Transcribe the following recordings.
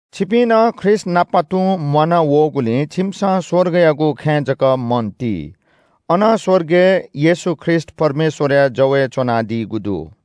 छिपिं नं ख्रीष्‍टनाप तुं म्‍वाना वःगुलिं छिमिसं स्‍वर्गयागु खँय् जक मन ति। अन स्‍वर्गय् येशू ख्रीष्‍ट परमेश्‍वरया जवय् च्‍वनादीगु दु।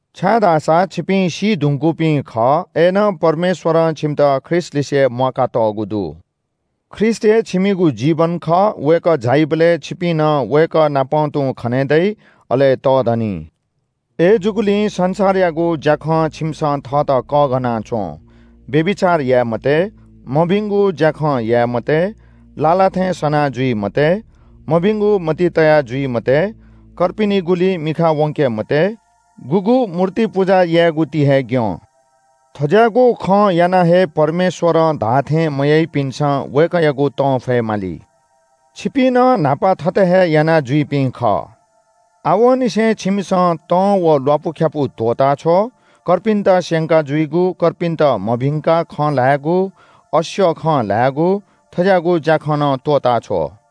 छाय्‌धाःसा छिपिं सी धुंकूपिं खः। अय्‌नं परमेश्‍वरं छिमित ख्रीष्‍टलिसे म्‍वाकातःगु दु। ख्रीष्‍ट हे छिमिगु जीवन खः। वय्‌कः झाइबलय् छिपिं नं वय्‌कःनापं तुं खने दइ, अले तःधनी। अय्‌जूगुलिं संसारयागु ज्‍याखं छिमिसं थःत कःघाना च्‍वँ। व्‍यभिचार याये मते, मभिंगु ज्‍याखँ याये मते, लाः लाः थें सना जुइ मते, मभिंगु मतिइ तया जुइ मते, कर्पिनिगुली मिखा वंके मते, गुगु मूर्ति पुजा यायेगु ति हे ग्‍यं। थज्‍याःगु खं यानाः हे परमेश्‍वरं धाःथें मयाइपिन्‍सं वय्‌कःयागु तं फयेमाली। छिपिं नं न्‍हापा थथे हे यानाजुइपिं खः। आवंनिसें छिमिसं तं व ल्‍वापुख्‍यापु त्‍वःताछ्व – कर्पिन्‍त स्‍यंका जुइगु, कर्पिन्‍त मभिंकाः खँ ल्‍हायेगु, अस्‍यः खँ ल्‍हायेगु – थज्‍याःगु ज्‍याखँ नं त्‍वःताछ्व।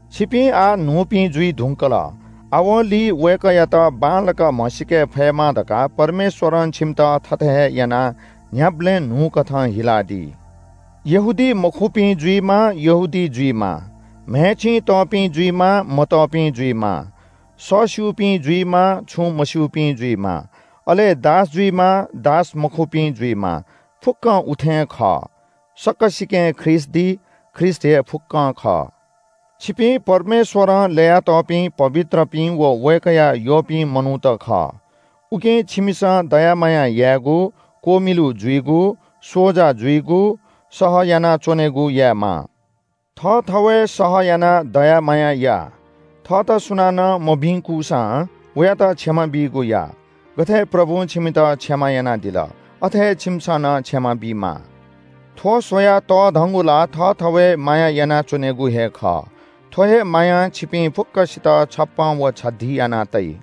छिपिं आः न्‍हूपिं जुइ धुंकल। आवंलि वय्‌कःयात बांलाक म्‍हसीके फयेमा धकाः परमेश्‍वरं छिमित थःथें हे यानाः न्‍ह्याबलें न्‍हूकथं हिलादी। यहूदीमखुपिं जुइमा, यहूदी जुइमा, म्‍हय् चिं तःपिं जुइमा, मतःपिं जुइमा, सःस्‍यूपिं जुइमा, छुं मस्‍यूपिं जुइमा, अले दास जुइमा, दासमखुपिं जुइमा, फुक्‍कं उथें खः। सकसिकें ख्रीष्‍ट दी। ख्रीष्‍ट हे फुक्‍कं खः। छिपिं परमेश्‍वरं ल्‍ययातःपिं पवित्रपिं व वय्‌कःया यःपिं मनूत खः। उकिं छिमिसं दया माया यायेगु, क्‍वमिलु जुइगु, स्‍वजा जुइगु, सह यानाच्‍वनेगु यायेमाः। थःथवय् सह यानाः दया माया या। थःत सुनानं मभिंकूसां वयात क्षमा बीगु या। गथे प्रभुं छिमित क्षमा यानादिल, अथे हे छिमिसं नं क्षमा बीमाः। थ्‍व स्‍वयाः तःधंगु ला थःथवय् माया यानाच्‍वनेगु हे खः। थ्‍व हे मायां छिपिं फुक्‍कसित छप्‍पँ व छधी याना तइ।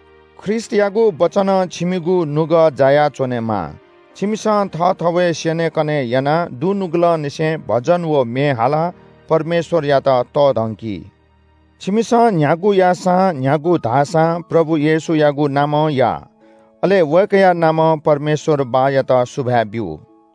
ख्रीष्‍टयागु वचनं छिमिगु नुगः जायाच्‍वनेमा। छिमिसं थःथवय् स्‍यनेकने यानाः दुनुगलंनिसें भजन व म्‍ये हालाः परमेश्‍वरयात तःधंकि। छिमिसं न्‍ह्यागु याःसां, न्‍ह्यागु धाःसां प्रभु येशूयागु नामं या, अले वय्‌कःया नामं परमेश्‍वर बाःयात सुभाय् ब्‍यु।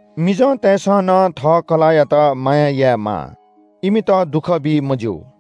मिजंतय्‌सं नं थः कलाःयात माया यायेमाः। इमित दुःख बी मज्‍यू।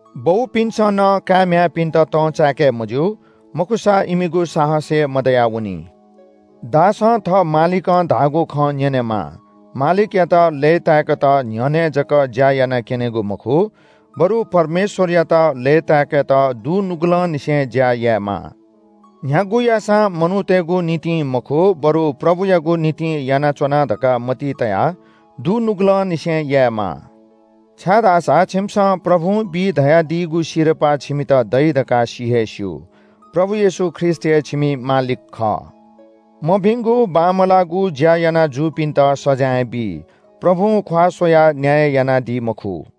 बौपिन्‍सं नं काय् म्‍ह्याय्‌पिन्‍त तं चाय्‌के मज्‍यू। मखुसा इमिगु साहस हे मदयावनी। दासं थः मालिकं धाःगु खँ न्‍यनेमाः। मालिकयात लय्‌ताय्‌केत न्‍ह्यःने जक ज्‍या याना क्‍यनेगु मखु, बरु परमेश्‍वरयात लय्‌ताय्‌केत दुनुगलंनिसें ज्‍या यायेमाः। न्‍ह्यागु याःसां मनूतय्‌गु निंतिं मखु, बरु प्रभुयागु निंतिं यानाच्‍वना धकाः मतिइ तयाः दुनुगलंनिसें यायेमाः। छाय्‌धाःसा छिमिसं प्रभुं बी धयादीगु सिरपाः छिमित दइ धकाः सि हे स्‍यू। प्रभु येशू ख्रीष्‍ट हे छिमि मालिक खः। मभिंगु बांमलाःगु ज्‍या याना जूपिन्‍त सजाँय बी। प्रभुं ख्‍वाः स्‍वयाः न्‍याय यानादी मखु।